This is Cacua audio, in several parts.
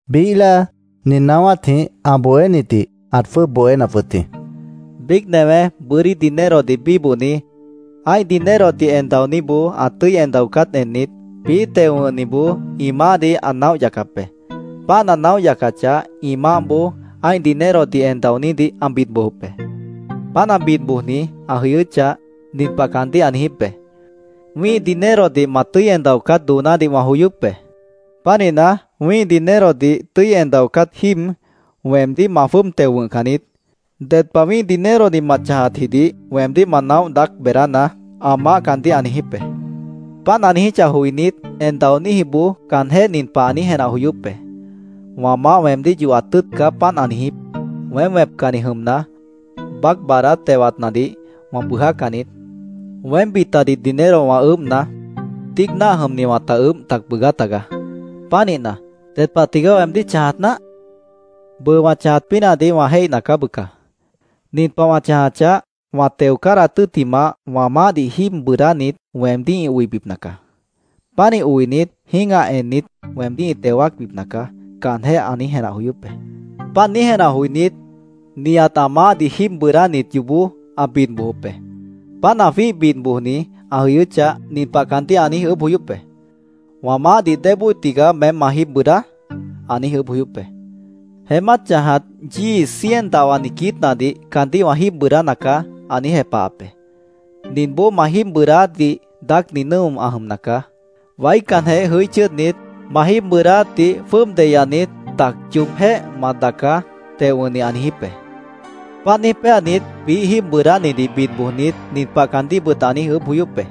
Biíh láa Jesús nin naáwátjĩh ã bohénitdih ãt jwʉ́ʉb bohénap wʉt jĩ: “Biíc newé bʉ́dí dinerodih bíbohni, ã́ih dinerodih en daoníboó ã tʉ́i en daocát ennit, biíh teo wʉ̃hniboó ĩ maáhdih ã naóh yacap be. Páant ã naóh yacachah, ĩ maáhboó ã́ih dinerodih en daonídih ã bid bojop be. Páant ã bid bojni ã jʉyʉ́chah, nin pah caandíh ã niijíp be: ‘Wĩ́ih dinerodih ma tʉ́i en daocát doonádih wã joyóp be. Pánihna, wĩ́ih dinerodih tʉ́i en daocát jíib weemdíh ma jwʉ́ʉb teo wʉ̃hcan niít. Ded pah wĩ́ih dinerodih ma chãjatjidih weemdíh ma naóh daác beedánaá’, ã maáh caandíh ã niijíp be. Páant ã niijíchah joinít, en daoníjiboó caanjéh nin pah ã niíj jenah joyóp be: ‘Wã maáh weemdíh yohat tʉ́ʉt caá páant ã niijíp. Weém wẽpcanni jʉmna, baác baadát tewatnadih wã bʉʉjácan niít. Weém bitadih dinero wã ʉʉ́bhna, tíic náah jʉmni wãta ʉʉ́bh tac bʉʉgá tagaá. Pánihna, ¿ded pah tigaá weemdíh chãjat náah? Bʉʉ, wã chãjat pínahdih wã jéihna caá, bʉca. Nin pah wã chãjachah, wã teo cádahat tʉ́ttimah, wã maáhdih jíib bʉʉdánit weemdíh ĩ oibipna nacaá. Pánih oinit, jĩ́gah ennit, weemdíh ĩ teo wáacbipna caá’, caanjéh ã niíj jenah joyóp be. Páant niíj jenah joinít, nihat ã maáhdih jíib bʉʉdánit yoobó ã bid bojop be. Páant ã jwíih bid bojni ã jʉyʉ́chah, nin pah caandíh ã niíj ʉʉ́bh joyóp be: ‘¿Wã maáhdih débóo tigaá meém ma jíib bʉʉdá?’ ã niíj ʉʉ́bh joyóp be. ‘Jeémát chãjat yíi cien dahwani quiítnadih caandíh wã jíib bʉʉdána caá’, ã niíj jepahap be. ‘Ninboó ma jíib bʉʉdáátdih daácni nʉ́o ã jʉmna caá. Waícanjeh jʉí chʉ́ʉdnit, ma jíib bʉʉdáátdih jwʉ́ʉb deyanit, tac yoobjéh ma daacá’, teo wʉ̃hni ã niijíp be. Páant niíj péanit, biíh jíib bʉʉdánidih bid bojnit, nin pah caandíhbʉt ã niíj ʉʉ́bh joyóp be: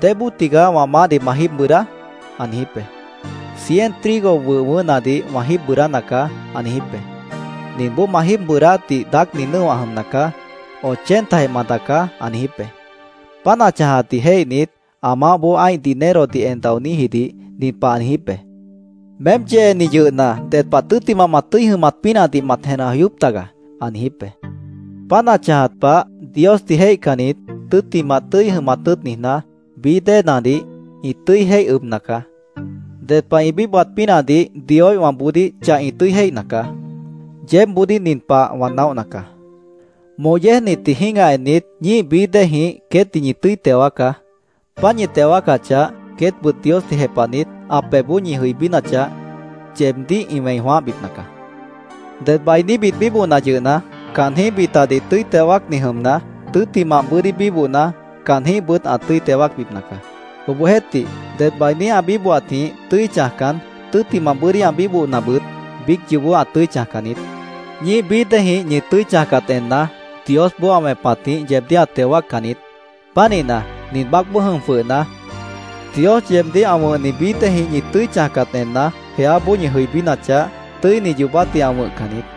‘¿Débóo tigaá wã maáhdih ma jíib bʉʉdá?’ ã niijíp be. ‘Cien trigo wʉh wʉʉ́hnadih wã jíib bʉʉdána caá’, ã niijíp be. ‘Ninboó ma jíib bʉʉdáátdih daácni nʉ́o ã jʉmna caá. Ochentajeh ma daacá’, ã niijíp be. Páant ã chãjatdih jéihnit, ã maáhboó ã́ih dinerodih en daoníjidih nin pah ã niijíp be: ‘Meém yeeni yʉhna, ded pah tʉ́ttimah ma tʉ́i jʉmat pínahdih mat jenah joyóp taga’, ã niijíp be. Páant ã chãjat pah, Diosdih jéihcannit, tʉ́ttimah tʉ́i jʉmat tʉ́ʉt niijná, bií déenadih ĩ tʉ́i jéih ʉbna caá. Ded pah ĩ bíbohat pínahdih Dioíhwãboodíh chah ĩ tʉ́i jéihna caá. “Yeébboodíh nin pah wã naóhna caá: Moh yéejnitdih jĩ́gah ennit, ñíih bií déejĩh queétdih ñi tʉ́i teo wáacá. Páant ñi teo wáacachah, queétbʉt Diosdih jepahnit, ã pebhboó ñi jʉibínachah, yeebdíh ĩ wẽi jwãáhbipna caá. “Ded bainíbit bíbohna yʉhna, caanjĩ́h bitadih tʉ́i teo wáacni jʉmna, tʉ́ttimah bʉ́dí bíbohna, caanjĩ́hbʉt ã tʉ́i teo wáacbipna caá. Obohjeéhtih, ded bainí ã bíbohatjĩh tʉ́i chãjcan, tʉ́ttimah bʉ́dí ã bíbohnabʉt, biíc yoobó ã tʉ́i chãjcan niít. Ñíih bií déejĩh ñi tʉ́i chãjcat enna, Diosboó ã wẽpatjĩh yeebdíh ã teo wáaccan niít. Pánihna, nin baácboó jʉm jwʉhna, Dios yeebdíh ã wʉ̃hni bií déejĩh ñi tʉ́i chãjcat enna, jeáboó ñi jʉibínachah, tʉ́ini yoobátdih ã wʉ̃hcan niít.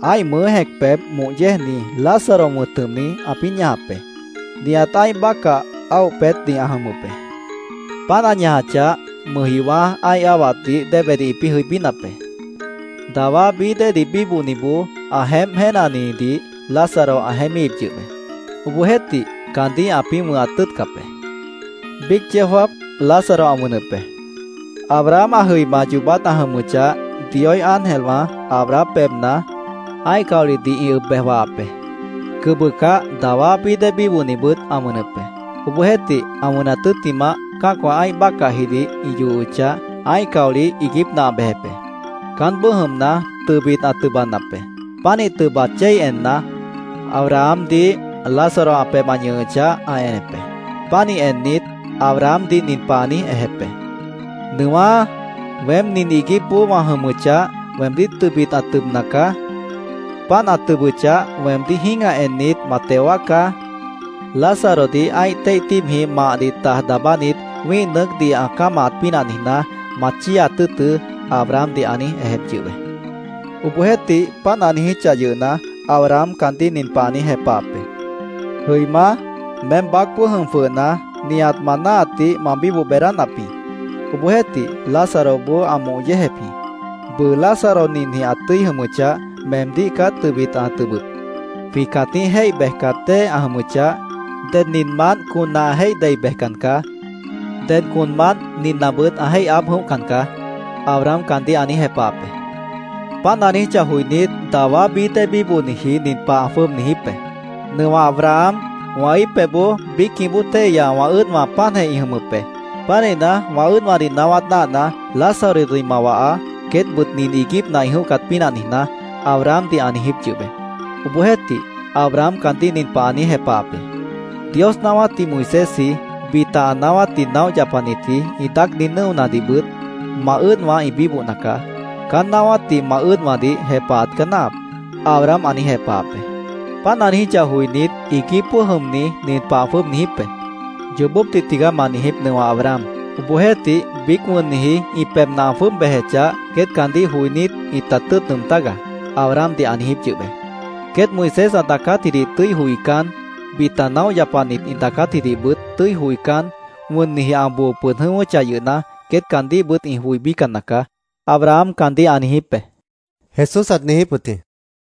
Ã́ih mʉʉ́ jẽc pebh moh yéejni, Lázaro wʉ̃t jʉmni, ãpĩ́ ñajap be. Nihat ã́ih bácah áoh peétni ã jʉmʉp be. Páant ã ñajachah, mʉjjiowã́ ã́ih áhwatnadih déebedih ĩpĩ́ jʉibínap be. Dawá bií déedih bíbohniboó ã jeémp jéenanidih Lázaro ã jeémíhip yʉh be. Obohjeéhtih, caandíh ãpĩ́ wʉ̃hat tʉ́ʉtcap be. Biíc yeó jáap, Lázaro ã wʉnʉp be. Abraham ã jʉima yoobát ã jʉmʉchah, Dioíh ángelwã Abraham pebhna ã́ih caolihdih ĩ ʉb bej wahap be. Cʉbʉcah, dawá bií dée bíbohnibʉt ã wʉnʉp be. Obohjeéhtih, ã wʉnat tʉ́ttimah, cã́acwã ã́ih bácahjidih ĩ yohochah, ã́ih caolih iiguípna ã bejep be. Caánboó jʉmna, tʉbit ã tʉbanap be. Pánih tʉba chéi enna, Abrahamdih, Lázaro ã pebh ã ñʉhʉchah, ã enep be. Pánih ennit, Abrahamdih nin pah ã niíj ejep be: ‘Nʉwá, weém nin iiguípboó wã jʉmʉchah, weemdíh tʉbit ã tʉbna caá. Páant ã tʉbʉchah, weemdíh jĩ́gah ennit, ma teo wáacá. Lázarodih ã́ih téih tíibjĩh mahdih taj daabánit, wĩ́ih nʉʉ́cdih ã cámahat pínah niijná, ma chíiaat tʉ́ʉtʉ́’, Abrahamdih ã niíj ejep yʉh be. Obohjeéhtih, páant ã niijíchah yʉhna, Abraham caandíh nin pah ã niíj jepahap be: ‘Jʉimá, meém baácboó jʉm jwʉhna, nihat ma náahatdih ma bíboh beedánap jĩ. Obohjeéhtih, Lázaroboó ã moh yéejep jĩ. Bʉʉ Lázaro ninjĩh ã tʉ́i jʉmʉchah, meemdíh caá tʉbit an tʉbʉp. Jwĩ cãtíh jéih bejcat dée ã jʉmʉchah, ded ninmant conna ã jéih dei bejcan caá. Ded conmant ninnabʉt ã jéih aáb jʉ̃óhcan caá’, Abraham caandíh ã niíj jepahap be. “Páant ã niijíchah joinít, dawá bií déedih bíbohniji nin pah ã jwʉ́ʉb niijíp be: ‘Nʉwah Abraham, wã íip pebhboó biícjĩh bóo téihya wã ʉ́ʉdwã páantjeh ĩ jʉmʉp be. Pánihna, wã ʉ́ʉdwãdih naáwát náahna, Lázarodih ma wahaá, queétbʉt nin iiguípna ĩ jʉ̃óhcat pínah niijná’, Abrahamdih ã niijíp yʉh be. Obohjeéhtih, Abraham caandíh nin pah ã niíj jepahap be: ‘Dios naáwátdih Moisésji, bita ã naáwátdih naóh yapanitji ĩ daácni nʉ́onadihbʉt ma ʉ́ʉdwã ĩ bíbohna caá. Caán naáwátdih ma ʉ́ʉdwãdih jepahat caá náahap’, Abraham ã niijíp be. Páant ã niijíchah joinít, iiguípboó jʉmni nin pah ã jwʉ́ʉb niijíp be: ‘Yoobópdih tigaá ma niijíp, Nʉwah Abraham. Obohjeéhtih, biíc wʉnniji ĩ pebhna ã jwʉ́ʉb bejechah, queét caandíh joinít, ĩta tʉ́ʉt nʉʉm tágaá’, Abrahamdih ã niijíp yʉh be. ‘Queét Moisés ã daacátjidih tʉ́i joicán, bita naóh yapanit ĩ daacátjidihbʉt tʉ́i joicán, wʉnniji ã boo pʉd jʉ̃ʉ́wʉ́chah yʉhna, queét caandíhbʉt ĩ joibícan nacaá’, Abraham caandíh ã niijíp be”, Jesús ãt niijíp wʉt jĩ.